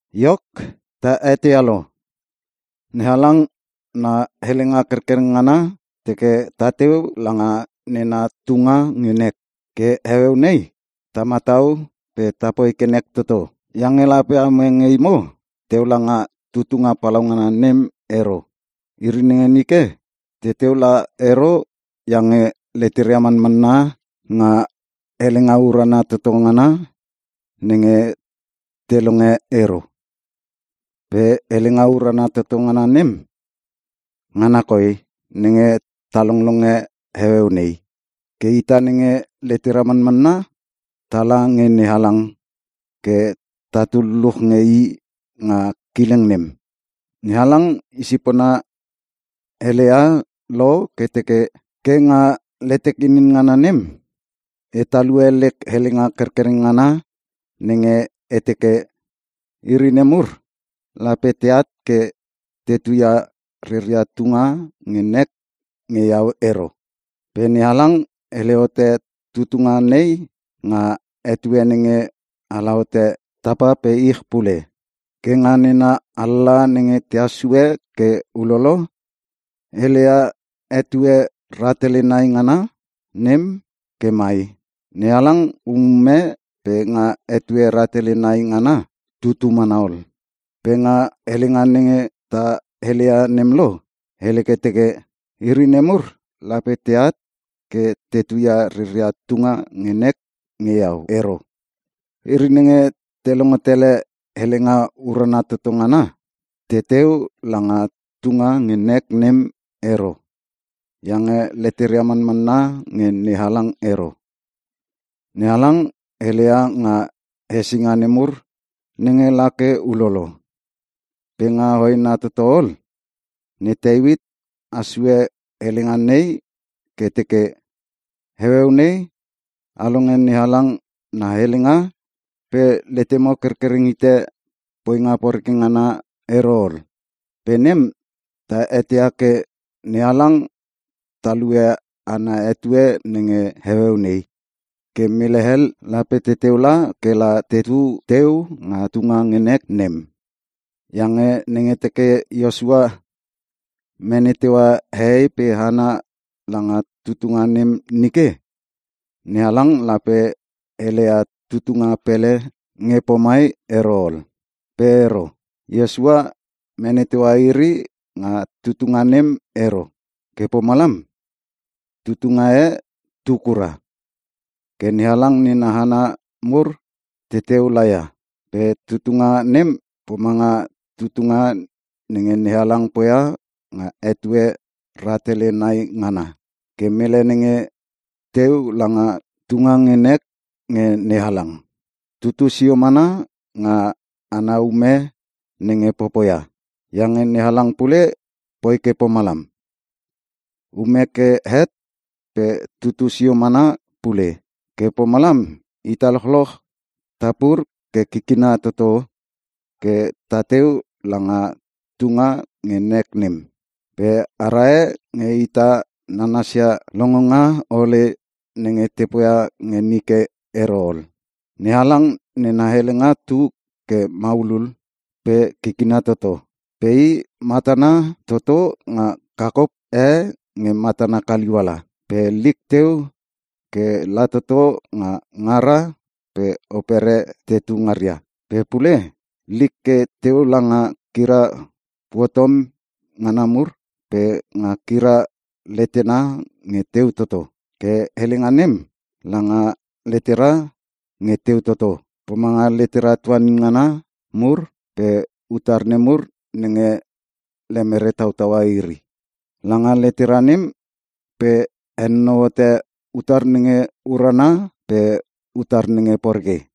Iok, ta eteia lo, NeHalang na helenga kerkerenga ngana teke tateu langa nena tunga nge nek. Ke heueu nei, ta matau pe tapoi ke nek toto. Iange lape amo e nge imo teu langa tutunga palaungana nem ero. Iri nenge nike, teteu la ero iange leteria manmanna nga helenga urana toto ngana nenge te longe ero. Pe helenga urana toto ngana nem, ngana koi nenge ta longlonge heueu nei. Ke ita nenge letera manmanna, tala nge NeHalang ke tatu luluch nge i nga kileng nem. NeHalang i sipona heleia lo ke teke, “Ke nga letek inin ngana nem, e talue lek helenga kerkereng ngana nenge e teke, “‘Iri nemur lape teat ke te tuia reria tunga nge nek nge iau ero.’” Pe NeHalang hele hote tutunga nei nga etue nenge alahote tapa pe ich pule. Ke nga nena alalaha nenge tehas sue ke ulolo, hele ia etue rahtele nai ngana nem ke mai, “NeHalang umume pe nga etue rahtele nai ngana, tutu mana ol.” Pe nga na helenga nenge ta heleia nem lo, hele ke teke, “Iri nemur lape teat ke te tuia reria tunga nge nek nge iau ero.” Iri nenge te longo tele helenga urana toto ngana, teteu langa tunga nge nek nem ero iange leteria manmanna nge NeHalang ero. NeHalang heleia nga hesinga nemur nenge la ke ulolo. Pe nga hoena toto ol, NeTeuit has sue helenga nei ke teke, “Heueu nei, a longe NeHalang na helenga pe letemo kerkereng hite poinga poreke ngana ero ol.” Pe nem ta eteia ke NeHalang talue ana etue nenge “Heueu Nei”. Ke mele hel lape teteu la ke la tetu teu nga tunga nge nek nem. Iange nenge teke Iosua mene teua hehei pe hana langa tutunga nem nike, NeHalang lape heleia tutunga pele nge pomai ero ol. Pe ero. Iosua mene teua iri nga tutunga nem ero. Ke pomalam, tutunga e tu kura. Ke NeHalang nena hana mur teteu la ia. Pe tutunga nem pomanga tutunga nenge NeHalang poia nga etue rahtele nai ngana. Ke mele nenge teu langa tunga nge nek nge NeHalang, tutu sio mana nga ana ume nenge popoia. Iange NeHalang pule poi ke pomalam, ume ke het pe tutu sio mana pule. Ke pomalam ita lochloch tapur ke kikina toto ke tateu langa tunga nge nek nem. Pe ara e nge ita nanasia longonga ole nenge te poia nge nike ero ol. NeHalang nena helenga tu ke maulul pe kikina toto. Pe i matana toto nga kakop e nge matana kaliuala. Pe lik teu ke la toto nga ngara pe opere tetu ngaria. Pe pule lik ke teu langa kira puotom ngana mur pe nga kira letena nge teu toto. Ke helenga nem langa letera nge teu toto. Pomanga letera tuanin ngana mur pe utar nemur nenge lemere tautaua iri. Langa letera nem pe henonou hote utar nenge urana pe utar nenge poreke.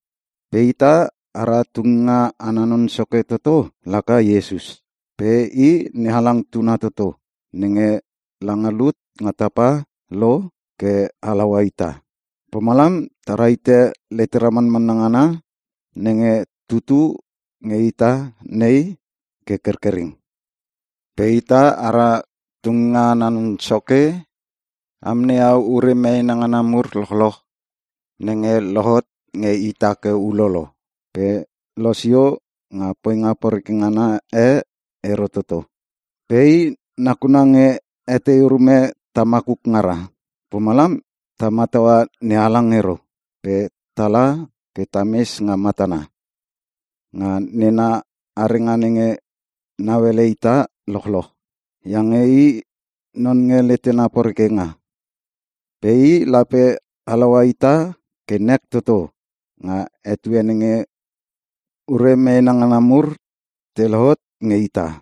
Pe ita ara tunginga ana non soke toto laka Iesus. Pe i NeHalang tuna toto nenge langa lut nga tapa lo ke halaua ita. Pomalam ta rahite letera manmanna ngana nenge tutu nge ita nei ke kerkereng. Pe ita ara tunginga ana non soke, amneia ure meena ngana mur lochloch nenge lohot nge ita ke ulolo, pe losio nga poinga poreke ngana e ero toto. Pe i nakuna nge etei urume ta makuk ngara. Pomalam ta mataua NeHalang ero pe tala ke tames nga matana, nga nena arenga nenge nauele ita lochloch. Iange i non nge lete porekenga. Pe i lape halaua ita ke nek toto nga etue nenge ure meena ngana mur te lohot nge ita.